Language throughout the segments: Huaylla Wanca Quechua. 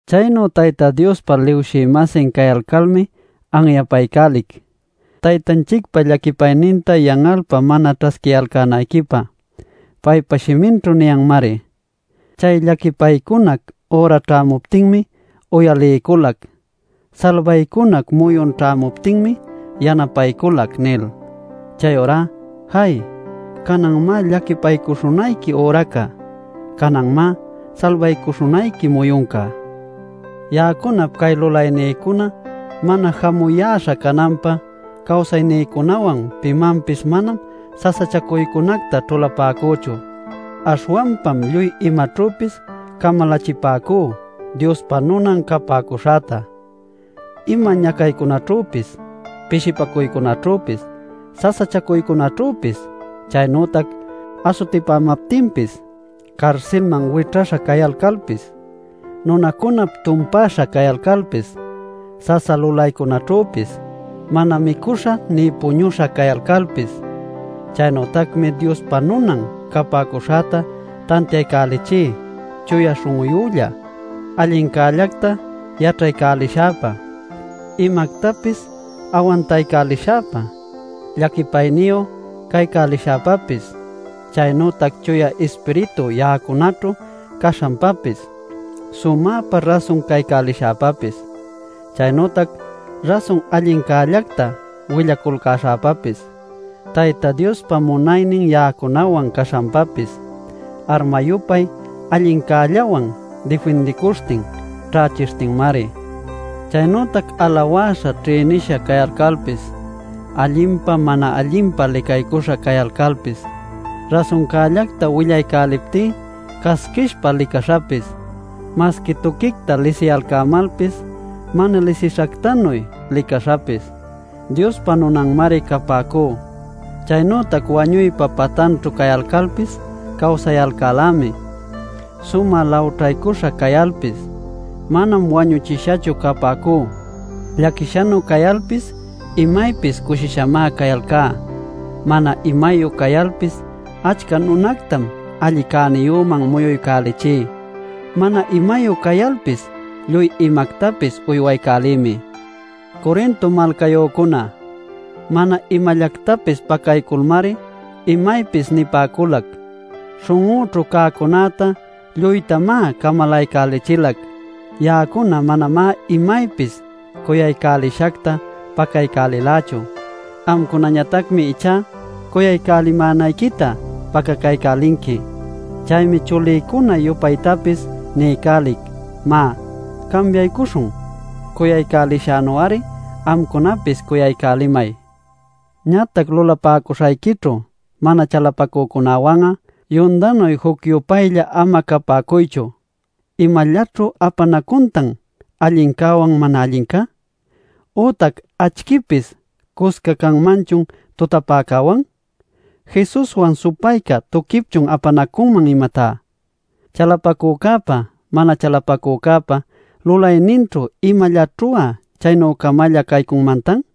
Chaynu Tayta Diospa lulawshï-masin cayalcalmi anyapaycälic, Taytanchicpa llaquipayninta yan'alpä mana ćhasquiyalcänayquipä. Paypa shiminćhu niyanmari: “Chay llaquipaycunac üra ćhämuptinmi uyaliyculac; Salbaycunac muyun ćhämuptinmi yanapayculac” nil. Chayurá ¡jay! ¡Cananmá llaquipaycuśhunayqui üraca! ¡Cananmá salbaycuśhunayqui muyunca! Ya'acunap cay lulaynïcuna mana jamuyäśha cananpä cawsaynïcunawan pimanpis manam sasachacuycunacta ćhulapäcüchu. Aśhwanpam lluy imaćhüpis camalachipäcú Diospa nunan capäcuśhäta: ima ñacaycunaćhüpis, pishipacuycunaćhüpis, sasachacuycunaćhüpis, chaynütac asutipämaptinpis, carsilcunaman wićhäśha cayalcalpis, nunacunap tumpäśha cayalcalpis, sasa lulaycunaćhüpis, mana micuśha nï puñuśha cayalcalpis. Chaynütacmi Diospa nunan capäcuśhäta tantiaycälichí chuya śhun'uyülla, allincällacta yaćhaycälishäpa, imactapis awantaycälishäpa, llaquipayniyu caycälishäpäpis; chaynütac Chuya Ispiritu ya'acunaćhu caśhanpapis, sumäpa rasun cuyaycälishäpapis; chaynütac rasun allincällacta willaculcäśhäpapis, Tayta Diospa munaynin ya'acunawan caśhanpapis, arma-yupay allincällawan difindiycuśhtin, ćhächishtinmari. Chaynütac alawäśha ćhïnisha cayalcalpis, allinpa, mana allinpa licaycuśha cayalcalpis; rasuncällacta willaycäliptí casquishpä licaśhapis; masqui tuquicta lisiyalcämalpis mana lisishactanuy licaśhapis, Diospa nunanmari capäcú. Chaynütac wañuypa patanćhu cayalcalpis cawsayalcälämi. Sumä lawćhaycuśha cayalpis, manam wañuchishachu capäcú. Llaquishanuy cayalpis imaypis cushishamá cayalcá. Mana imayu cayalpis achca nunactam alli cäniyüman muyuycälichí. Mana imayu cayalpis lluy imactapis uywaycälïmi. Corinto malcayücuna, mana imallactapis pacayculmari imaypis nipäculac; śhun'üćhu cäcunäta lluytamá camalaycälichilac. Ya'acuna manamá imaypis cuyaycälishacta pacaycälilächu; amcunañatacmi ichá cuyaycälimänayquita pacacaycälinqui. Chaymi chulïcuna-yupaytapis niycälic: má cambiaycuśhun: cuyaycälishänu-ari amcunapis cuyaycälimay. Ñatac lulapäcuśhayquićhu mana chalapacücunawan'a yundanuy juc-yupaylla ama capäcuychu. ¿Imallaćhu apanacuntan allincäwan mana allinca? ¿Ütac acchïpis cusca canmanchun tutapäcäwan? ¿Jesuswan supayca tuquipchun apanacunman, imatá? ¿Chalapacücäpa mana chalapacücäpa lulayninćhu imallaćhu'a chaynü-camalla caycunmantan?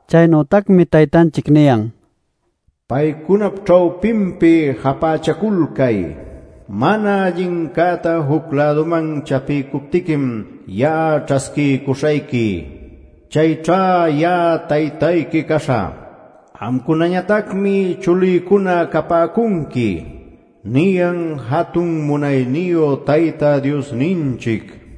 Chaynütacmi Taytanchic niyan: “Paycunap ćhawpinpi japächaculcay. Mana allincäta juc-läduman chapiycuptiquim ya'a ćhasquiycuśhayqui.” “ ‘Chayćha ya'a Taytayqui caśhä; Amcunañatacmi chulïcuna capäcunqui’ niyan jatun munayniyu Tayta Diosninchic” nil.